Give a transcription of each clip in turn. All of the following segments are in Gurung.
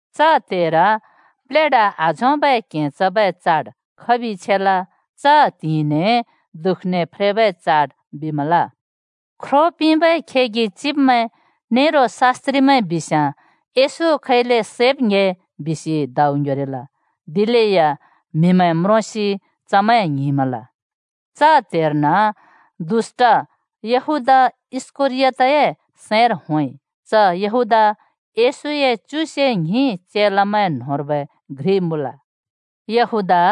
च त्हेर प्लेढा आझोंबै क्‍हें चबै चाड खबि छेल। च त्हिंइने दुःखने फ्रेबै चाड बिमल। ख्रो पिंबै खेगि चिब्मैं नेरो शास्‍त्रिमैं बिस्याँ येशू खैले सैब् ङ्‍हे बिसि दाउ ङ्‍ह्‍योरिल। दिलेया म्‍हिमैं म्रोंसि चमैं ङ्हिंमल। च त्‍हेर्न यहूदा इस्‍करियोतए सैंर दुष्‍ट होंइ। च यहूदा येशूए च्युसे ङ्हिं चेलामैं न्‍होंर्बै घ्रि मुँल। यहूदा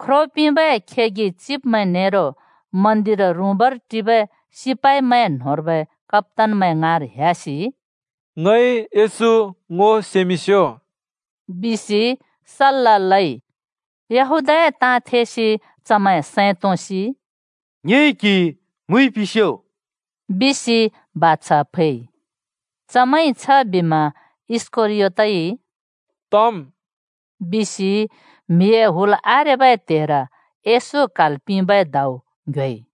ख्रो पिंबै खेगि चिब्मैं नेरो मन्दिर रुँबर टिबै सिपाइमैं न्होंर्बै कप्‍तानमैं ङाँर ह्‍यासि, “ङइ येशू ङो सेमिंस्यो बिसि सल्‍ला लइ।” यहूदाए ताँ थेसि चमैं सैं तोंसि “ङिइ क्‍हि मुइ पिंस्‍यो,” बिसि बाछा फैइ। चमैंइ छबिमा इस्‍करियोतइ “तम्” बिसि म्‍हिए हुल आरेबै त्हेर येशू क्‍हाल् पिंबै दाउ ङ्‍ह्‍योइ।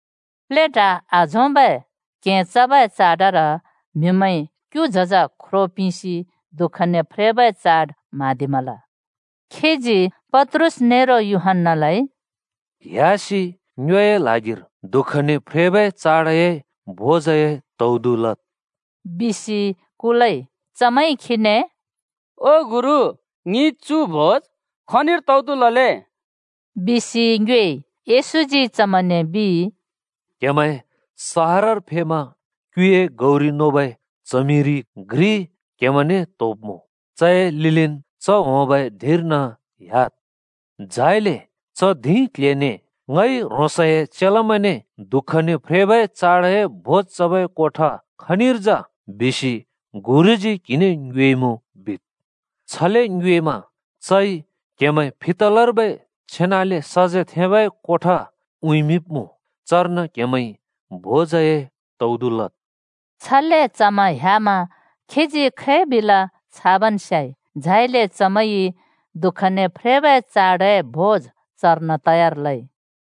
प्लेढा आझोंबै क्हें चबै चाडर म्हिमैंइ क्‍यु झज ख्रो पिंसि दुःखने फ्रेबै चाड म्हाँदिमल। खीजी पत्रुस नेरो यूहन्‍नालाइ “ह्‍यासि ङ्योए ल्हागिर दुःखने फ्रेबै चाडए भोज तौदु लद्,” बिसि कुलइ। चमैंइ खीने “ओ गुरु, ङिइ चु भोज खनिर तौदु लले?” बिसि ङ्योएइ। येशूजी चमैंने बिइ, “क्‍हेमैं सहरर फेमा क्‍युए गौरि नोबै च्हमिरि घ्रि क्‍हेमैंने त्‍होब्‍मुँ। चए लिलिन् च होंबै धिंर्न ह्‍याद्। झाइले च धिं क्‍ल्‍हेने ‘ङइ ह्रोंसए चेलामैंने दुःखने फ्रेबै चाडए भोज चबै कोठा खनिर जा? बिसि गुरुजी क्हिने ङ्योएमुँ,’ बिद्। छले ङ्योएमा चइ क्‍हेमैं फितलर्बै छेनाले सजेथेंबै कोठा उँइँमिंब्‍मुँ। चर्न क्हेमैंइ भोजए तौदु लद्।” छले चमैं ह्‍यामा खीजी खै बिल छाबन् स्याइ। झाइले चमैंइ दुःखने फ्रेबै चाडए भोज चर्न तयार लइ।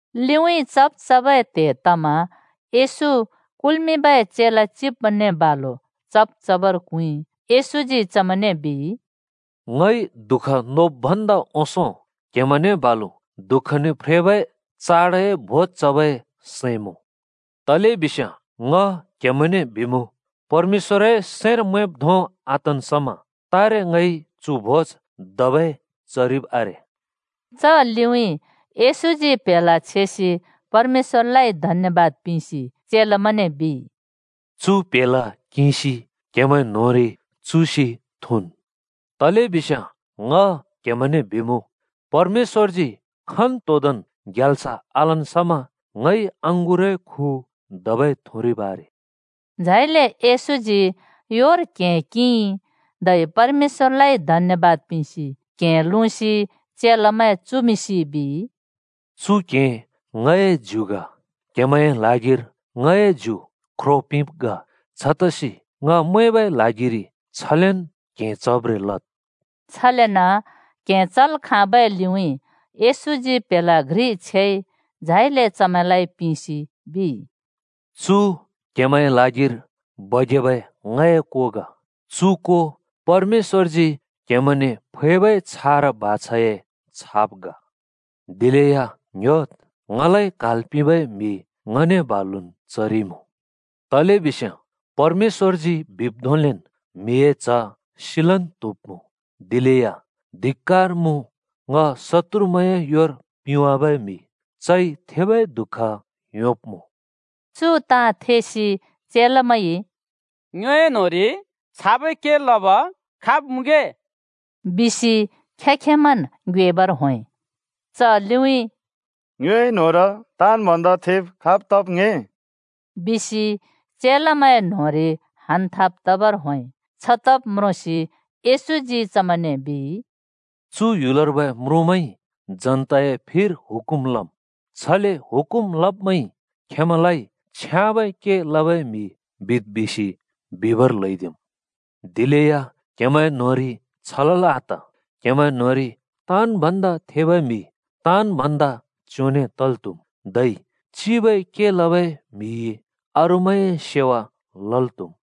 लिउँइँ चब् चबै त्‍हे तमा येशू कुल्मिंबै चेला चिब्मैंने बालु चब् चबर क्हुँइ। येशूजी चमैंने बिइ, “ङइ दुःख नोब् भन्दा ओंसों क्हेमैंने बालु दुःखने फ्रेबै चाडए भोज चबै सैं मुँ। तलेबिस्याँ ङ क्‍हेमैंने बिमुँ, परमेश्‍वरए सैंर मैंब् धों आतन् समा तारे ङइ चु भोज धबै चरिब आरे।” च लिउँइँ येशूजी प्‍हेला छेसि परमेश्‍वरलाइ धन्‍यबाद पिंसि चेलामैंने बिइ, “चु प्‍हेला किंसि क्‍हेमैं न्‍होंरि चुसि थुँन्। तलेबिस्याँ ङ क्‍हेमैंने बिमुँ, परमेश्‍वरजी खन्‍तोंदोंन् ग्याल्स आलन् समा ङइ अँगुरए खु धबै थुरिब् आरे।” झाइले येशूजी योर क्हें किंइ धै परमेश्‍वरलाइ धन्‍यबाद पिंसि क्‍हें लुँसि चेलामैं चुमिंसि बिइ, “चु क्‍हें ङए ज्यु ग। क्‍हेमैंए ल्हागिर ङए ज्यु ख्रो पिंब् ग। छतसि ङ मैंबै ल्हागिरि छलेन् क्हें चब्रें लद्।” छलेन क्हें चल् खाँबै लिउँइँ येशूजी प्‍हेला घ्रि छेइ, झाइले चमैंने पिंसि बिइ, “चु क्‍हेमैंए ल्हागिर बगेबै ङए को ग। चु को परमेश्‍वरजी क्‍हेमैंने फैबै छारा बाछाए छाप ग। “दिलेया ङ्ह्‍योद्! ङलाइ क्‍हाल् पिंबै म्‍हि ङने बालुन् चरिइमुँ। तलेबिस्याँ परमेश्‍वरजी बिब् धोंलेन् म्हिए च्ह सिलन् त्हुब्‍मुँ। दिलेया धिक्‍कार मुँ ङ शत्तुरमैंए योर पिंवाबै म्‍हि चइ थेबै दुःख योंब्‍मुँ।” चु ताँ थेसि चेलामैंइ “ङ्योए न्‍होंरि छाबै के लब खाब मुँगे?” बिसि खें-खेंमैंन् ङ्योएबर होंइ। च लिउँइँ “ङ्योए न्होंर ताँन् भन्दा थेब खाब् तब् ङ्‍हें?” बिसि चेलामैंए न्‍होंरि हानथाप तबर होंइ। छतब् म्रोंसि येशूजी चमैंने बिइ, “चु ह्‍युलर्बै म्रुँमैंइ जनताए फिर हुकुम लम्। छले हुकुम लब्मैंइ खेंमैंलाइ छ्याँबै के लबै म्हि बिद् बिसि बिबर ल्हैदिम्। दिलेया क्‍हेमैं न्‍होंरि छ तल् आत। क्‍हेमैं न्‍होंरि ताँन् भन्दा थेबै म्‍हि ताँन् भन्दा च्‍योंने तल् त्‍हुम्। धै चिबै के लबै म्हिइ अरूमैंए सेवा लल् त्‍हुम्।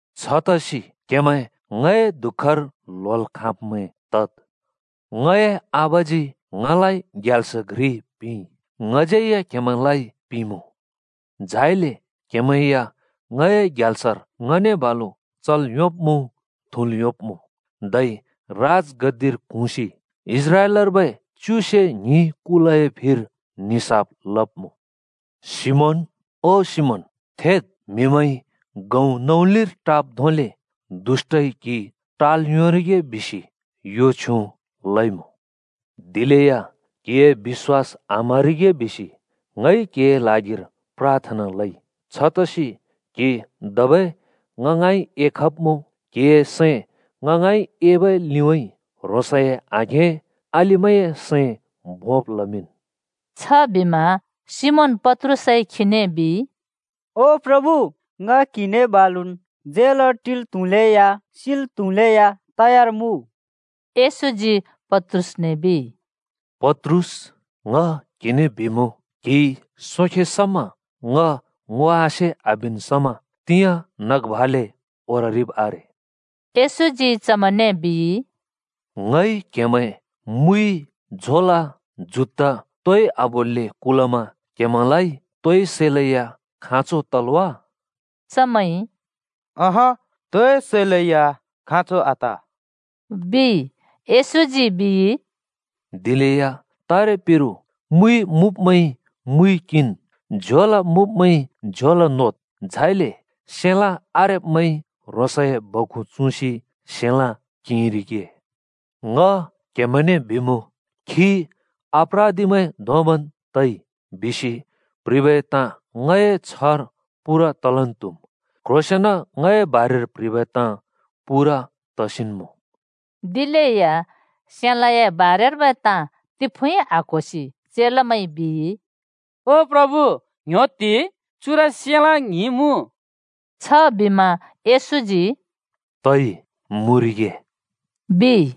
“छतसि क्हेमैं ङए दुःखर ल्‍होल् खाँब्मैं तद्। ङए आबाजी ङलाइ ग्याल्स घ्रि पिंइ। ङज्‍यै या क्‍हेमैंलाइ पिंमुँ। झाइले क्‍हेमैं या ङए ग्याल्सर ङने बालु चल् योंब्‍मुँ, थुँल् योंब्‍मुँ। धै राजगद्दिर क्हुँसि इस्राएलर्बै च्युसे ङ्हिं कुलए निसाफ लब्‍मुँ।” “ओ सिमोन, सिमोन, थेद्! म्हिमैंइ नौलिर गहुँ टाब् धोंले दुष्‍टइ क्‍हि टाल् योंरिगे बिसि यो छ्युँ लइमुँ। दिलेया क्‍हिए बिश्‍वास आम्‍हरिगे बिसि ङइ क्‍हिए ल्हागिर प्राथना लइ। छतसि क्‍हि धबै ङ ङाँइन एखब्मुँ, क्हिए सैं ङ ङाँइ एबै लिउँइँ ह्रोंसए आघें अलिमैंए सैं भोंब् लमिंन्।” छबिमा सिमोन पत्रुसइ खीने बिइ, “ओ प्रभु, ङ क्‍हिने बालुन् झेलर टिल् त्‍हुलेया, सिल् त्‍हुलेया तयार मुँ।” येशूजी पत्रुसने बिइ, “पत्रुस, ङ क्हिने बिमुँ, क्हिइ सोंखे समा ङ ङो आसे आबिन् समा तिंयाँ नग भाले ओररिब् आरे।” येशूजी चमैंने बिइ, “ङइ क्‍हेमैं मुइ, झोला, जुत्ता तोइ आबोल्‍ले कुलमा क्हेमैंलाइ तोइ सैलेया खाँचो तल् वा?” चमैंइ “अहँ, तोइ सैलेया खाँचो आत,” बिइ। येशूजी बिइ, “दिलेया तारेपिरु ‘मुइ मुँब्मैंइ मुइ किंन्, झोला मुँब्मैंइ झोला नोद्’, झाइले ‘सेलाँ आरेब्मैंइ ह्रोंसए बखु चुँसि सेलाँ किंरिगे।’ ङ क्हेमैंने बिमुँ, ‘खी अपराधिमैं धोंबन् तइ’ बिसि प्‍ह्रिबै ताँ ङए छ्हर पूरा तलन् त्हुम्। क्ह्रोंसेंन ङए बारेर प्ह्रिबै ताँ पूरा तसिन् मुँ।” दिलेया सेलाँए बारेर्बै ताँ तिफुँइ आक्‍होसि चेलामैंइ बिइ, “ओ प्रभु, ङ्‌ह्‍योत्ति! चुर सेलाँ ङ्हिं मुँ।” छबिमा येशूजी “तइ! मुँरिगे,” बिइ।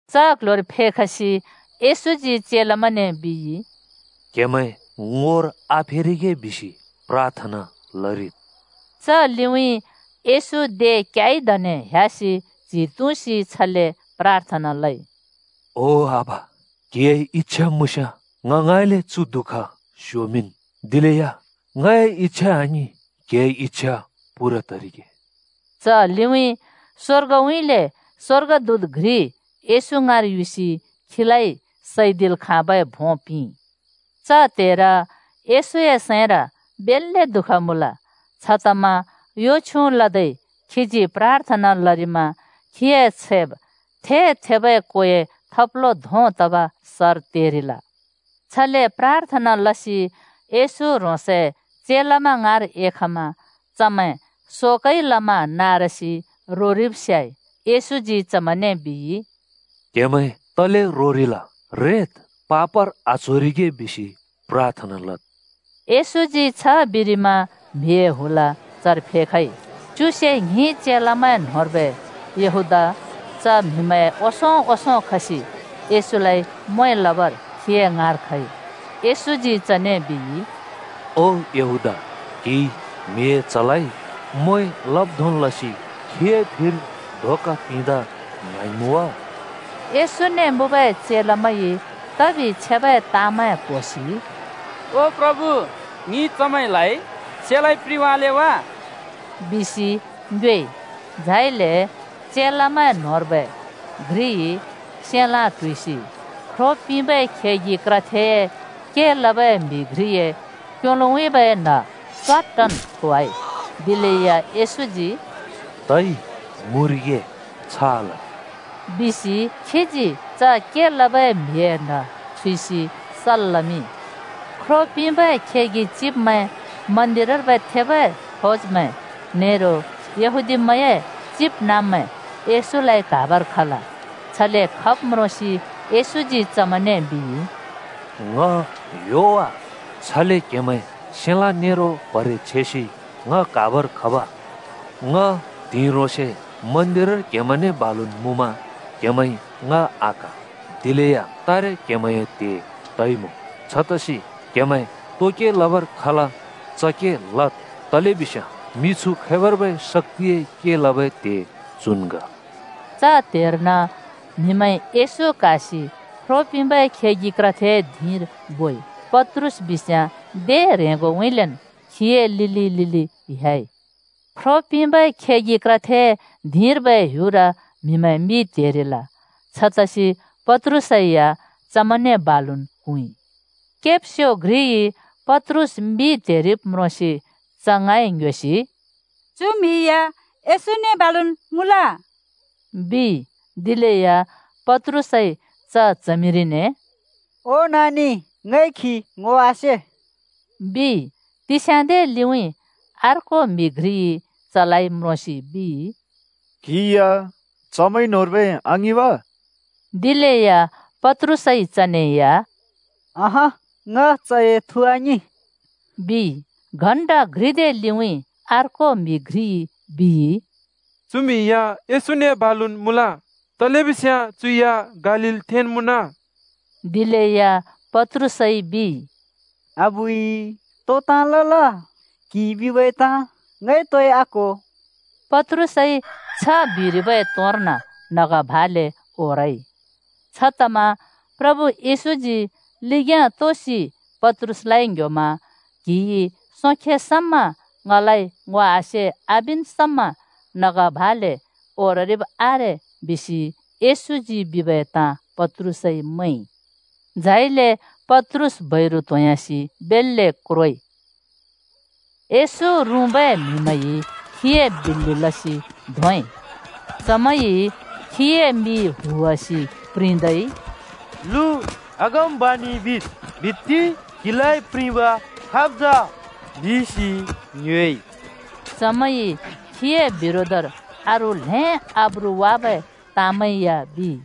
च क्‍ल्‍ह्‍योर फेखसि येशूजी चेलामैंने बिइ, “क्‍हेमैं ङोर आफेरिगे बिसि प्राथना लरिद्।” च लिउँइँ येशू दे क्‍याइ दने ह्‍यासि च्‍हि तुँसि छले प्राथना लइ। “ओ आबा, क्‍हिए इच्छा मुँस्‍याँ ङ ङाँइँले चु दुःख स्‍योमिंन्। दिलेया ङए इच्छा आङिं, क्‍हिए इच्छा पूरा तरिगे।” च लिउँइँ स्‍वर्गउँइँले स्‍वर्गदूत घ्रि येशू ङाँर युसि खीलाइ सैदिल् खाँबै भों पिंइ। च त्‍हेर येशूए सैंर बेल्‍ले दुःख मुँल। छतमा यो छ्युँ लदै खीजी प्राथना लरिमा खीए छैब् थे-थेब कोए थब्लो धों तब सर तेरिल। छले प्राथना लसि येशू ह्रोंसए चेलामैं ङाँर एखमा चमैं शोकइ लमा नारसि रोरिब स्याइ। येशूजी चमैंने बिइ, “क्‍हेमैं तले रोरिल? रेद्, पापर आच्होरिगे बिसि प्राथना लद्।” येशूजी छ बिरिमा म्‍हिए हुल चर फेखइ। च्युसे ङ्हिं चेलामैं न्‍होंर्बै यहूदा च म्‍हिमैंए ओंसों ओंसों खसि येशूलाइ म्वें लबर खीए ङाँर खइ। येशूजी चने बिइ, “ओ यहूदा, ‘क्हिइ’ म्हिए च्हलाइ म्वें लब् धों लसि खीए फिर धोका पिंदा ङ्हाँइमुँ वा?” येशूने मुँबै चेलामैंइ तबि छेबै ताँमैं क्‍होसि “ओ प्रभु, ङिइ चमैंलाइ सेलाँइ प्रिंवाले वा?” बिसि ङ्योएइ। झाइले चेलामैं न्‍होंर्बै घ्रिइ सेलाँ (तरबार) ट्हुइसि ख्रो पिंबै खेगि क्रथेए के लबै म्हि घ्रिए क्‍योलोउँइँबै न्‍ह च्‍वाट्टन् थोवाइ। दिलेया येशूजी “तै मुँरिगे! छ आलद्!” बिसि खीजी च के लबै म्हिए न्‍ह छुइसि सल् लमिंइ। ख्रो पिंबै खेगि चिब्मैं, मन्दिरर्बै थेबै फौजमैं नेरो यहूदीमैंए चिबनाँब्मैं येशूलाइ क्‍हाबर खल। छले खब् म्रोंसि येशूजी चमैंने बिइ, “ङ ह्‍यो वा? छले क्हेमैं सेलाँ नेरो प्‍हरे छेसि ङ क्‍हाबर खब? ङ त्हिंइ ह्रोंसे क्‍हेमैंने ‍बालुन् मन्दिरर मुँमा क्‍हेमैंइ ङ आक्हा। दिलेया तारे क्हेमैंए त्हे तइमुँ। छतसि क्हेमैं तो के लबर खल, च के लद्, तलेबिस्याँ मिछु खैबर्बै शक्‍तिए के लबै त्हे चुन् ग।” च त्‍हेर्न म्हिमैंइ येशू क्‍हासि ख्रो पिंबै खेगि क्रथेए धिंर बोइ, पत्रुस बिस्याँ दे ह्रेंगोउँइँलेन् खीए लिलि लिलि ह्‍याइ। ख्रो पिंबै खेगि क्रथेए धिंर्बै ह्‍युर म्‍हिमैं मि त्हेरिल। छतसि पत्रुसै या चमैंने बालुन् क्हुँइ। केब्स्यो घ्रिइ पत्रुस मि त्हेरिब म्रोंसि च ङाँइ ङ्‌ह्‍योसि “चु म्हि या येशूने बालुन् मुँल,” बिइ। दिलेया पत्रुसइ च च्हमिरिने “ओ नानि, ङइ खी ङो आसे,” बिइ। तिस्याँदे लिउँइँ अर्को म्‍हि घ्रिइ चलाइ म्रोंसि बिइ, “क्‍हि या चमैं न्होंर्बै आङिं वा?” दिलेया पत्रुसइ चने या “अहँ, ङ चए थु आङिं,” बिइ। घण्‍टा घ्रिदे लिउँइँ अर्को म्‍हि घ्रिइ बिइ, “चु म्हि या येशूनेन् बालु मुँल। तलेबिस्याँ चु या गालीलथेंन् मुँन।” दिलेया पत्रुसइ बिइ, “अबुइ, तो ताँ लल? क्‍हिइ बिबै ताँ ङइ तोइ आक्‍हो!” पत्रुसइ छ बिरिबै तोंर्न नग भाले ओरइ। छतमा प्रभु येशूजी लिग्‍याँ तोसि पत्रुसलाइ ङ्ह्‍योमा “क्हिइ सोंखे समा ङलाइ ङो आसे आबिन् समा नग भाले ओररिब् आरे,” बिसि येशूजी बिबै ताँ पत्रुसइ मैंइ। झाइले पत्रुस बैरु त्‍होंह्‍यासि बेल्‍ले क्रोइ। येशू रुँबै म्‍हिमैंइ खीए बिल्‍लि लसि धोंइ। चमैंइ खीए मि हुवासि प्रिंदै “लु अगमबाणि बिद्, बित्ति क्‍हिलाइ प्रिंब खाब् जा? बिसि ङ्योएइ।” चमैंइ खीए बिरोधर अरू ल्‍हें आब्रु वाबै ताँमैं या बिइ।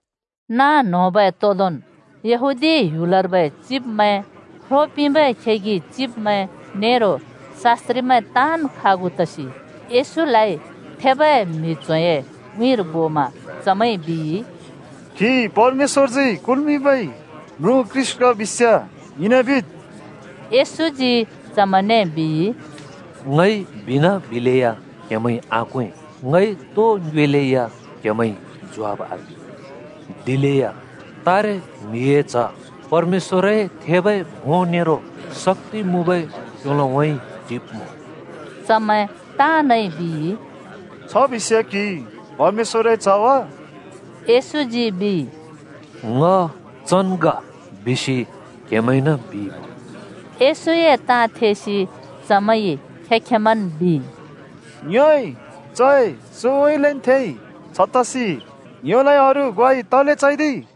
नाँ न्होंबै तोदोंन् यहूदी ह्‍युलर्बै चिब्मैं, ख्रो पिंबै खेगि चिब्मैं नेरो शास्‍त्रिमैं ताँन् खागु तसि येशूलाइ थेबै म्हि च्होंए उँइँर बोमा चमैंइ बिइ, “क्‍हि परमेश्‍वरजी कुल्‍मिंबै म्रुँ ख्रीष्‍ट ग बिस्‍याँ ङिने बिद्।” येशूजी चमैंने बिइ, “ङइ बिनाबिलेया क्‍हेमैंइ आक्वें। ङइ तो ङ्योएलै या क्‍हेमैंइ ज्वाफ आपिं। दिलेया तारे म्हिए च्ह परमेश्‍वरए थेबै भों नेरो शक्‍ति मुँबै क्‍योलोउँइँ टिब्‍मुँ।” चमैं ताँनइ बिइ, “छ बिस्‍याँ क्‍हि परमेश्‍वरए च्‍हन् वा?” येशूजी बिइ, “ङ चन् ग बिसि क्‍हेमैंइन बिइमुँ।” येशूए ताँ थेसि चमैंइ खें-खेंमैंन् बिइ, “ङ्योइ चए सुँउँइँलेन् थेइ, छतसि ङ्योलाइ अरू ग्वाइ तले चैदिइ?”